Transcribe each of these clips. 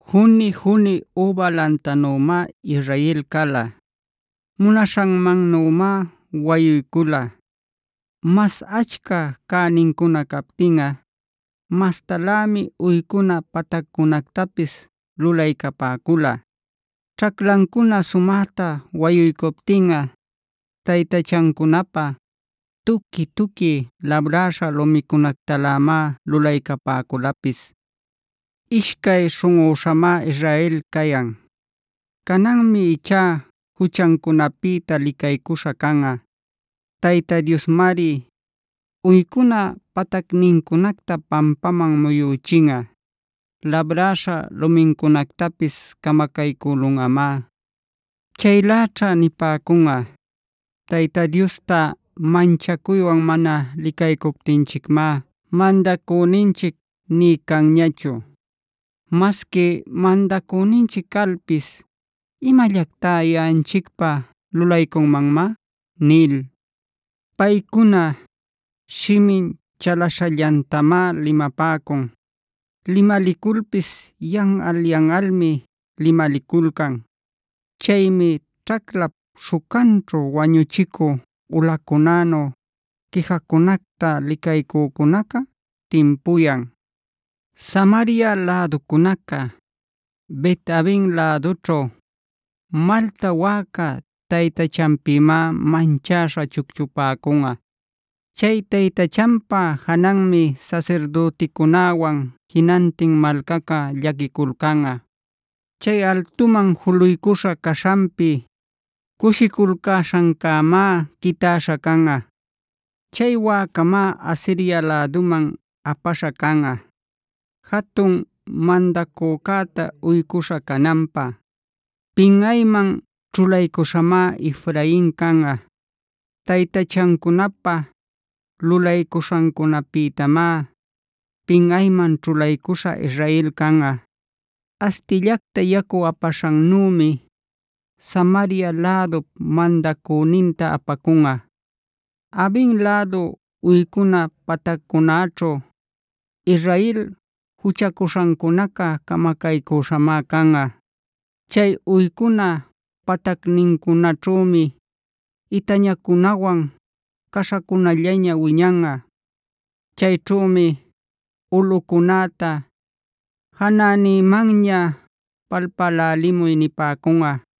Juni-juni üba lantanümá Israel cala. Munaśhanmannümá wayuycula. Mas achca cänincuna captinꞌa mastalämi uycuna pataccunactapis lulaycapäcula. Ćhaclancuna sumäta wayuycuptinꞌa taytachancunapä tuqui-tuqui labräśha lumicunactalämá lulaycapäculapis. Ishcay śhunꞌüśhamá Israel cayan. Cananmi ichá juchancunapïta licaycuśha canꞌa. Tayta Diosmari, uycuna patacnincunacta pampaman muyüchinꞌa; labräśha lumincunactapis camacaycülunꞌamá. Chayläćha nipäcunꞌa: “Tayta Diosta manchacuywan mana licaycuptinchicmá mandacüninchic nï canñachu. Masqui mandacüninchic calpis, ¿imallactá yaꞌanchicpä lulaycunmanmá?” nil. Paycuna shimin chalaśhallantamá limapäcun. Limaliculpis yanꞌal-yanꞌalmi limaliculcan. Chaymi ćhaclap śhucanćhu wañuchicü ulacunänu quijacunacta licaycücunaca timpuyan. Samaria läducunaca Bet-avena lädućhu malta wäca taytachanpïmá manchäśha chucchupäcunꞌa. Chay taytachanpa jananmi sasirdüticunäwan jinantin malcaca llaquiculcanꞌa. Chay altuman juluycuśha caśhanpi cushiculcäśhancämá quitäśha canꞌa. Chay wäcamá Asiria läduman apaśha canꞌa jatun mandacücäta uycuśha cananpä. Pinꞌayman ćhulaycuśhamá Efrain canꞌa; taytachancunapä lulaycuśhancunapïtamá pinꞌayman ćhulaycuśha Israel canꞌa. Astillacta yacu apaśhannümi Samaria lädup mandacüninta apacunꞌa. Aven lädu uycuna pataccunaćhu Israel juchacuśhancunaca camacaycüśhamá canꞌa. Chay uycuna patacnincunaćhümi itañacunawan caśhacunallaña wiñanꞌa. Chayćhümi ulꞌucunäta “janänïmanña palpälälimuy” nipäcunꞌa.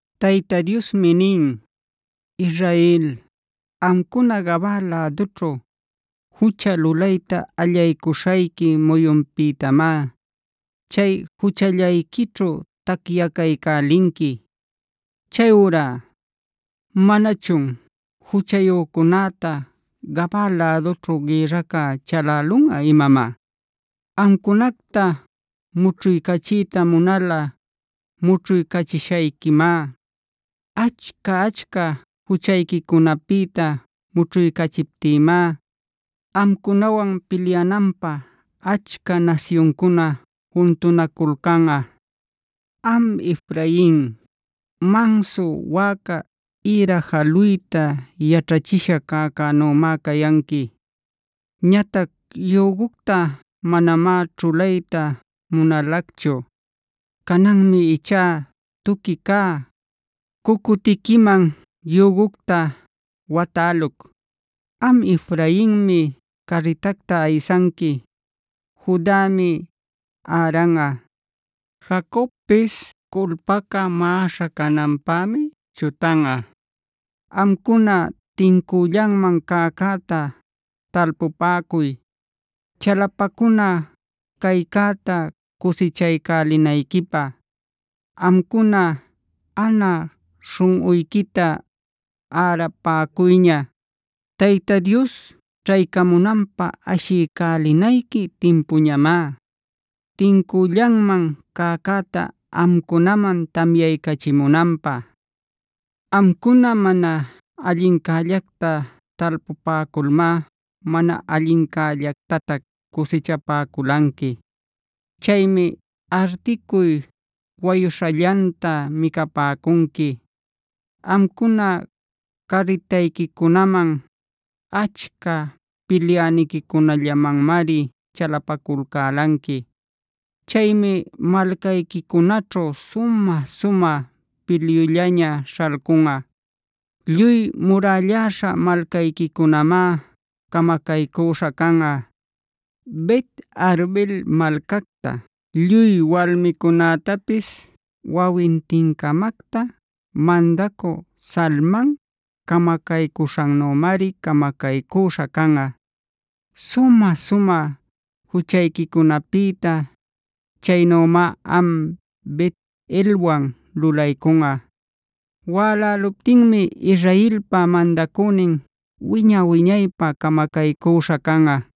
Tayta Diosmi nin: “Israel, amcuna Gabaa lädućhuc jucha lulayta allaycuśhayqui muyunpïtamá chay juchallayquićhu tacyacaycälinqui. Chayurá, ¿manachun juchayücunäta Gabaa lädućhu gïrraca chalälunꞌa imamá? Amcunacta mućhuycachiyta munalꞌa mućhuycachishayquimá. Achca-achca juchayquicunapïta mućhuycachiptïmá amcunawan pilyananpä achca nasyuncuna juntunaculcanꞌa. “Am Efrain, mansu wäca ïra jaluyta yaćhachisha cäcänümá cayanqui. Ñatac yügucta manamá ćhulayta munalacchu. Cananmi ichá tuqui cä cucutiquiman yügucta watäluc. Am Efrainmi carritacta aysanqui. Judami äranꞌa. Jacobpis culpaca maꞌaśha cananpämi chutanꞌa. “Amcuna tincüllanman cäcäta talpupäcuy, chalapacuna caycäta cusichaycälinayquipä. Amcuna anä śhunꞌuyquita ärapäcuyña; Tayta Dios ćhaycamunanpä ashiycälinayqui timpuñamá, tincüllanman cäcäta amcunaman tamyaycachimunanpä. “Amcuna mana allincällacta talpupäculmá mana allincällactatac cusichapäculanqui. Chaymi articuy wayuśhallanta micapäcunqui. Amcuna carritayquicunaman, achca pilyäniquicunallamanmari chalapaculcälanqui. Chaymi malcayquicunaćhu sumä-sumä pilyullaña śhalcunꞌa. Lluy murälläśha malcayquicunamá camacaycüśha canꞌa. Bet-arbel malcacta lluy walmicunätapis wawintin-camacta mandacü Salman camacaycüśhannümari camacaycüśha canꞌa. Sumä-sumä juchayquicunapïta chaynümá am Bet-elwan lulaycunꞌa. Wäläluptinmi Israelpa mandacünin wiña-wiñaypä camacaycüśha canꞌa.